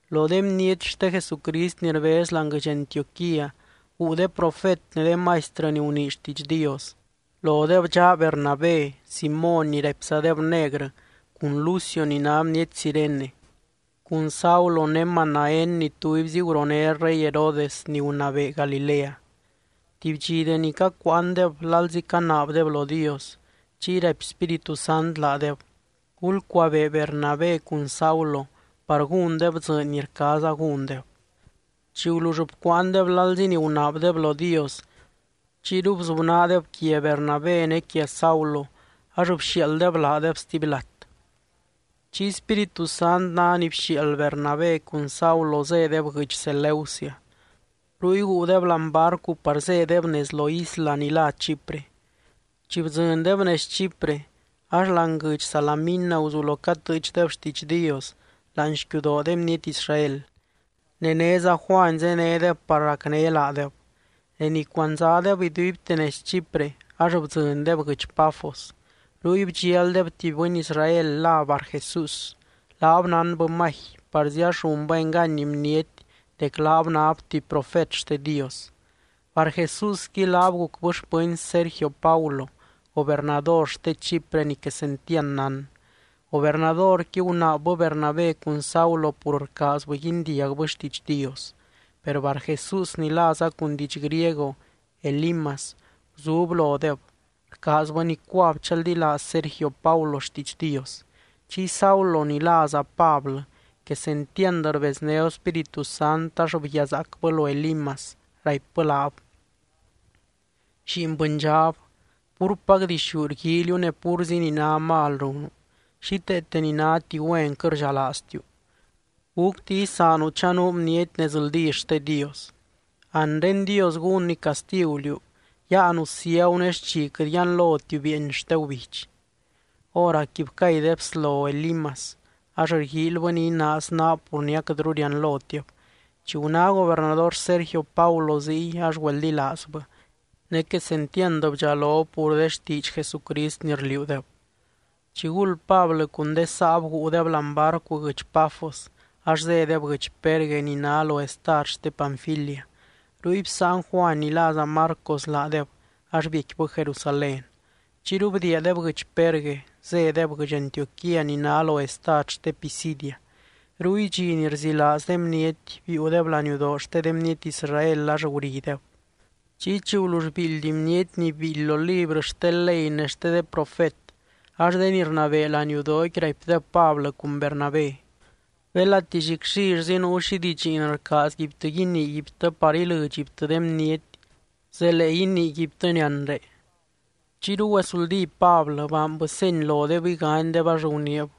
Lo de bniety xte Jesucrist ni rbez láani guɨdx Antioquía, guu de profet ne de maistrɨ ni gunii xtiidx Dios. Lodeb dxaa Bernabé, Simóny ni raipzadeb negrɨ cun Lucio ni ná bniety Cirene, cun Saulo ne Manaén ni tubyzi guroné rey Herodes ni gunabee Galilea. Tuby dxi deni cacuuandeb lalzi canaabdeb lo Dios, chiy raipy Spíritu Sant laadeb: —Gulcuabee Bernabé cun Saulo par gúndeb dzɨɨny ni rcaaza gúndeb. Chi gulull bcuuandeb lalzi ni gunaabdeb lo Dios, chiyru bzubnaadeb quia Bernabé ne quia Saulo ax bxiaalddeb laadeb stuby lat. Chiy Spíritu Sant ná ni bxiaald Bernabé cun Saulo zédeb guɨdx Seleucia. Ruy guudeb láani barcu par zédeb nez lo isla ni lá Chipre. Chi bdzɨndeb nez Chipre ax láani guɨdx Salamina guzulo catɨɨchdeb xtiidx Dios láani xquiudoo de bniety Israel. Ne néza Juany zénedeb par racné laadeb. De ni cuandzadeb iduibte nez Chipre ax bdzɨndeb guɨdx Pafos. Ruy bdxialdeb tuby bɨny Israel lá Barjesús, laab nánbɨ magi, parzi ax runbɨ engany bniety dec laab náb tuby profet xte Dios. Barjesúsqui laab gucbɨ xpɨny Sergio Paulo, gobernador xte Chipre ni quesentiand nán. Gobernadorqui gunaabbɨ Bernabé cun Saulo pur rcaazbɨ guindiagbɨ xtiidx Dios. Per Barjesús (ni láza cun diidx griego, Elimas) guzub lodeb, rcaazbɨ nicuab chaldilaaz Sergio Paulo xtiidx Dios. Chiy Saulo ni láza Pablɨ quesentiand rbeznéb Spíritu Sant ax bguiazaacbɨ lo Elimas, raipbɨ laab: —¡Lliin bɨndxab, púrpac dixú rguíiliu ne púrzi ni ná mal runu, xíteete ni náti güen quɨt rdxalaaztiu! ¿Gúcti isaanu chanuu bniety nezldí xte Dios? Anre Dios gúnny castigu liú. Yáanu ciagu ne xchi quɨt yianlotiu bieeny xte gubidx. Hóracqui bcay de bslo Elimas, ax rguíilybɨ ni inaaz naab pur ni aquɨtru rianlotib. Chi guná gobernador Sergio Paulo ziy, ax güeldilaazbɨ. Ne quesentiand bdxalob pur de xtiidx Jesucrist ni rliuudeb. Chiguld Pablɨ cun de saab guudeb láani barcu guɨdx Pafos, ax zédeb guɨdx Perge ni ná lo estad xte Panfilia. Ruy bsáan Juany ni láza Marcos laadeb, ax biecquibɨ Jerusalén. Chiyru bdiiadeb guɨdx Perge, zédeb guɨdx Antioquía ni ná lo estad xte Pisidia. Ruy dxi ni rzilaaz de bniety, biiudeb laniudoo xte de bniety Israel ax gurideb. Chiy, chi gulull biildy bniety ni biildy lo librɨ xte ley ne xte de profet, ax de ni rnabee laniudooqui raipdeb Pablɨ cun Bernabé: —Belati llicllillzi nuu xi didxiin rcaazguibtɨ iniiguibtɨ par ilɨdxguibtɨ de bniety, zelee iniiguibtɨni anre. Chiyru güezuldí Pablɨ, baanbɨ seny lodeb iganydeb ax guniib: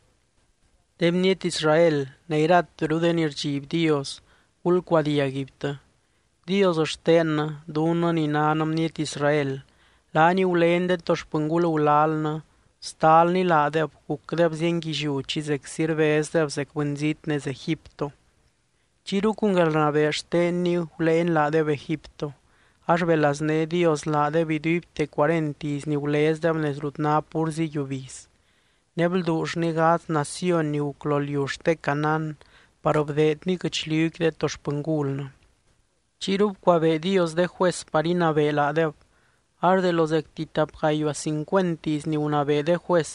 —De bniety Israel, ne irateru de ni rdxiby Dios, gulcuadiag guibtɨ. Dios xtennɨ, dunnɨ ni nan bniety Israel, laany gulény de to xpɨngul gulalnɨ, bstalny laadeb gucdeb zienguilliú chi zeczi rbezdeb zec bɨnzít nez Egipto. Chiyru cun guelrnabee xtenny guléeny laadeb Egipto. Ax belazné Dios laadeb iduibte cuarent iz ni gulezdeb nez rut ná púrzi yiubiz, ne blduullny gadz naciony ni guc lo liu xte Canaán par bdeedny guɨchliuqui de to xpɨngulnɨ. Chiyru bcuabee Dios de juez par inabee laadeb, ax de lo zecti tap gayuaa cincuent iz ni gunabee de juez,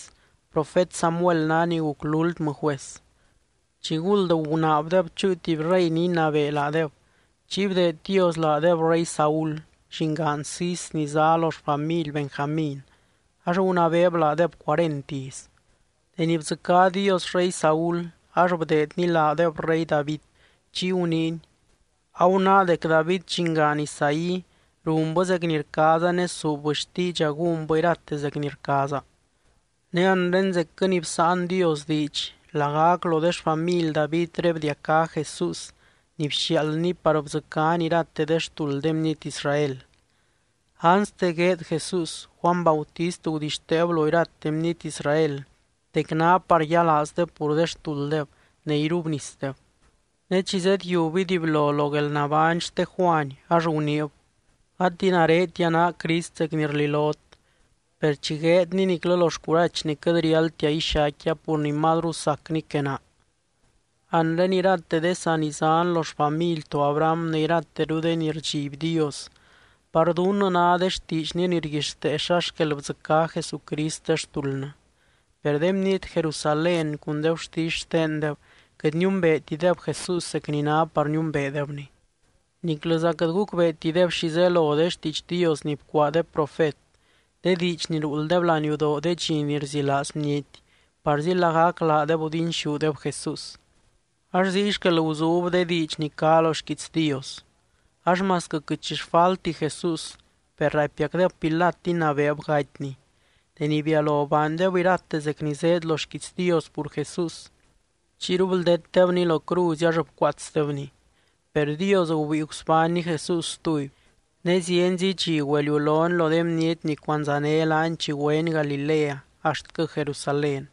profet Samuel ná ni guc lúltmɨ juez. Chiguld gunaabdeb chúu tuby rey ni inabee laadeb. Chiy bdeed Dios laadeb rey Saúl, llingaan Cis ni zá lo xfamily Benjamín, ax gunabeeb laadeb cuarent iz. Deni bdzɨcá Dios rey Saúl, ax bdeedny laadeb rey David. Chiy guniiny: “Agunáa dec David, llingaan Isaí, runbɨ zec ni rcaaza ne suubbɨ xtiidxa gúnbɨ irate zec ni rcaaza.” Ne anre zecquɨ ni bsáan Dios diidx lagac lo de xfamily Davidré bdiacá Jesús ni bxiaaldny par bdzɨcány irate de xtuld de bniety Israel. Anste gueed Jesús, Juany Bautist gudixteeb lo irate bniety Israel dec ná par yialaazdeb pur de xtulddeb ne irubnisdeb. Ne chi zedyiub iduiblo lo guelnabány xte Juany, ax guniib: “Gati naretia ná Crist zec ni rlilot. Per chi gueedny niclɨ lo xcurachny quɨt riáldtia ixaicquia pur ni mazru sacny que naa.” ’Anre irate de sanizán lo xfamily to Abraham ne irateru de ni rdxiby Dios, par dunnɨ ná de xtiidxny ni rguixtee xa xquel bdzɨcá Jesucrist de xtuldnɨ. Per de bniety Jerusalén cun de gurtisy xtendeb quɨt niumbeetideb Jesús zec ni ná par niumbeedebny. Niclɨza quɨt gucbeetideb xi zelo de xtiidx Dios ni bcuaa de profet, de diidx ni ruulddeb laniudoo de dxi ni rzilaaz bniety, parzi lagac laadeb gudinxúdeb Jesús. Ax ziy xquel guzub de diidx ni cá lo xquiits Dios. Ax masquɨ quɨt xi xfalti Jesús, per raipiacdeb Pilat inabeeb gatyny. Deni bialo baandeb irate zec ni zéed lo xquiits Dios pur Jesús, chiyru bldetdebny lo cruzy ax bcuaatsdebny. Per Dios gubíi gusbánny Jesús stuby. Ne zienzi dxi güeliulony lo de bniety ni cuandzané laany chi güeny Galilea axtquɨ Jerusalén.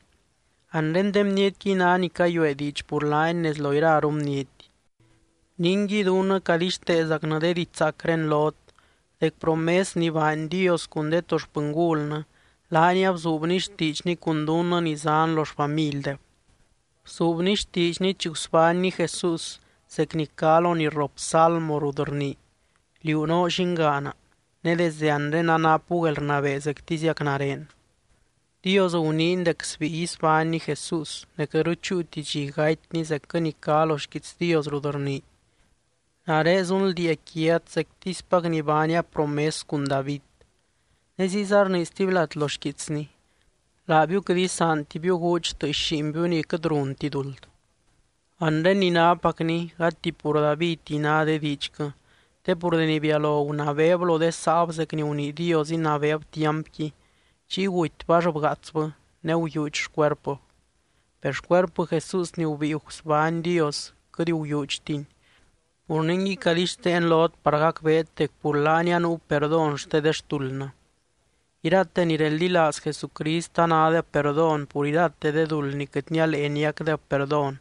Anre de bnietquiy ná ni cayuee diidx pur laany nez lo iraru bniety. ’Ningui, dunnɨ cadixteezacnɨ de didxzaacré lot, dec promes ni baany Dios cun de to xpɨngulnɨ, laany abzuubny xtiidxny cun dunnɨ ni zán lo xfamildeb. Bzuubny xtiidxny chi gusbánny Jesús zec ni cá lo ni rrop Salmo rut rnii: “Liú noo llingaana. Ne desde anre anapu guelrnabee zectiziac nare.” Dios guniiny dec sbíi isbánny Jesús ne quɨtru chúuti dxi gatyny zecquɨ ni cá lo xquiits Dios rut rnii: “Nare zunldiia quiat zectispac ni baania promes cun David.” Ne ziyza rnii stuby lat lo xquiitsny: “Laabiu quɨt isaantibiu gúudx tɨɨx lliinbiu ni quɨt runti duld.” Anre ni nápacni, gati pur Davidti ná de diidxquɨ, te pur deni bialo gunabeeb lo de saab zec ni gunii Dios inabeeb tiampqui, chiy gutybɨ ax bgaatsbɨ ne guyuudx xcuerpɨb. Per xcuerpɨ Jesús ni gubíi gusbány Dios, quɨt guyuudxtini. Pur ningui cadixteen lot par gacbeet dec pur laany anuu perdón xte de xtuldnɨ. Irate ni reldilaaz Jesucrist anádeb perdón pur irate de duld ni quɨt nialee niacdeb perdón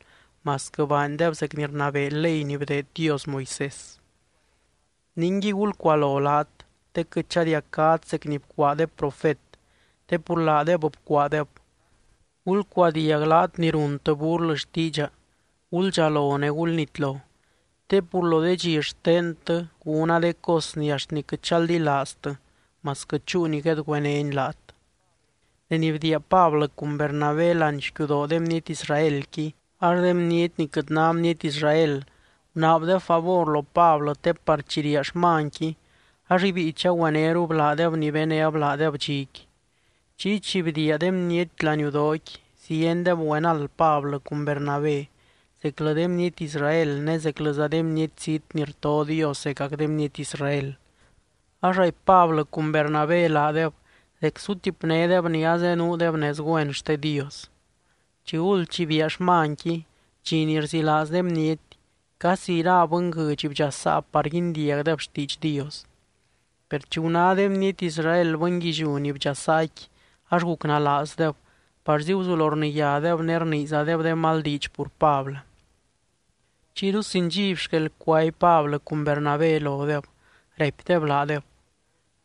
masquɨ baandeb zec ni rnabee ley ni bdeed Dios Moisés. Ningui gulcualo laat, te quɨt chadiacát zec ni bcuaa de profet, te pur laadeb bcuaadeb: Gulcuadiag laat ni runtɨ burlɨ xtiidxa. Guldxalo ne gulnitlo, te pur lo de dxi xtentɨ gúna de cos ni axt quɨt chaldilaaztɨ masquɨ chúu ni guedgüenéni laat. Deni bdiia Pablɨ cun Bernabé láani xquiudoo de bniety Israelqui, ax de bniety ni quɨt ná bniety Israel gunaabdeb favor lo Pablɨ te par chi riaa xmanqui ax ibíi chagüenérub laadeb ni benéb laadeb dxiqui. Chiy chi bdiia de bniety laniudooqui, ziendeb güenald Pablɨ cun Bernabé, zeclɨ de bniety Israel ne zeclɨza de bniety zít ni rto Dios zecac de bniety Israel. Ax raipy Pablɨ cun Bernabé laadeb dec sutipnédeb ni azenuudeb nez güen xte Dios. Chiguld chi biaa xmanqui, dxi ni rzilaaz de bniety, casi ira bɨnguɨdx bdxasaa par guindiagdeb xtiidx Dios. Per chi guná de bniety Israel bɨnguilliú ni bdxasaaqui, ax gucnalaazdeb parzi guzulo rniyádeb ne rniizadeb de mal diidx pur Pablɨ. Chiyru sin dxiby xquel cuaby Pablɨ cun Bernabé lodeb, raipdeb laadeb: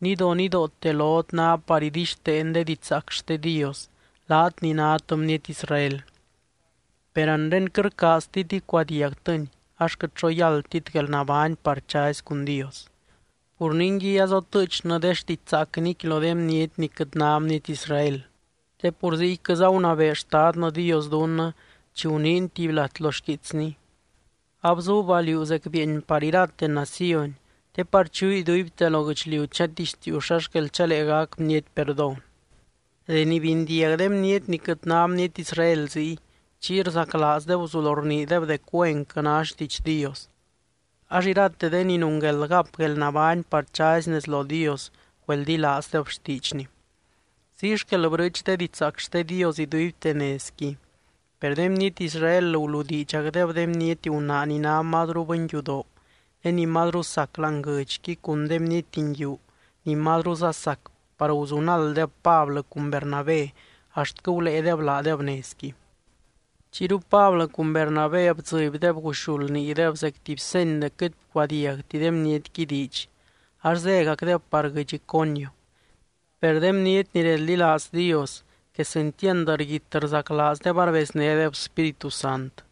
—Nidonidoote lot ná par idixteen de didxzaac xte Dios, laat ni nát bniety Israel. Per anre quɨt rcaaztit icuadiagtɨni, ax quɨt xo yáldtit guelnabány par chazy cun Dios. Pur ningui azotɨɨchnɨ de xtidxzaacniqui lo de bniety ni quɨt ná bniety Israel. Te pur ziyquɨza gunabee Xtadnɨ Dios dunnɨ, chi guniiny tuby lat lo xquiitsny: Abzuuba liú zec bieeny par irate naciony, te par chuu iduibte lo guɨchliu chatixtiiu xa xquel chalee gac bniety perdón. Deni bindiag de bniety ni quɨt ná bniety Israel ziy, chiy rzaclaazdeb guzulo rniideb dec güenquɨ ná xtiidx Dios. Ax irate de ni nungueld gap guelnabány par chazy nez lo Dios, güeldilaazdeb xtiidxny. Ziy xquel brɨɨch de didxzaac xte Dios iduibte nezqui. Per de bniety Israel guludiidxacdeb de bniety gunaa ni ná mazru bɨnyudoo ne ni mazru sac láani guɨdxqui cun de bniety nguiu ni mazruza sac par guzunalddeb Pablɨ cun Bernabé axtquɨ guléedeb laadeb nezqui. Chiyru Pablɨ cun Bernabé bdzɨbydeb guxuld niideb zec tuby seny dec quɨt bcuadiagti de bnietqui diidx, ax zégacdeb par guɨdx Iconio. Per de bniety ni reldilaaz Dios, quesentiand rguit rzaclaazdeb arbeznédeb Spíritu Sant.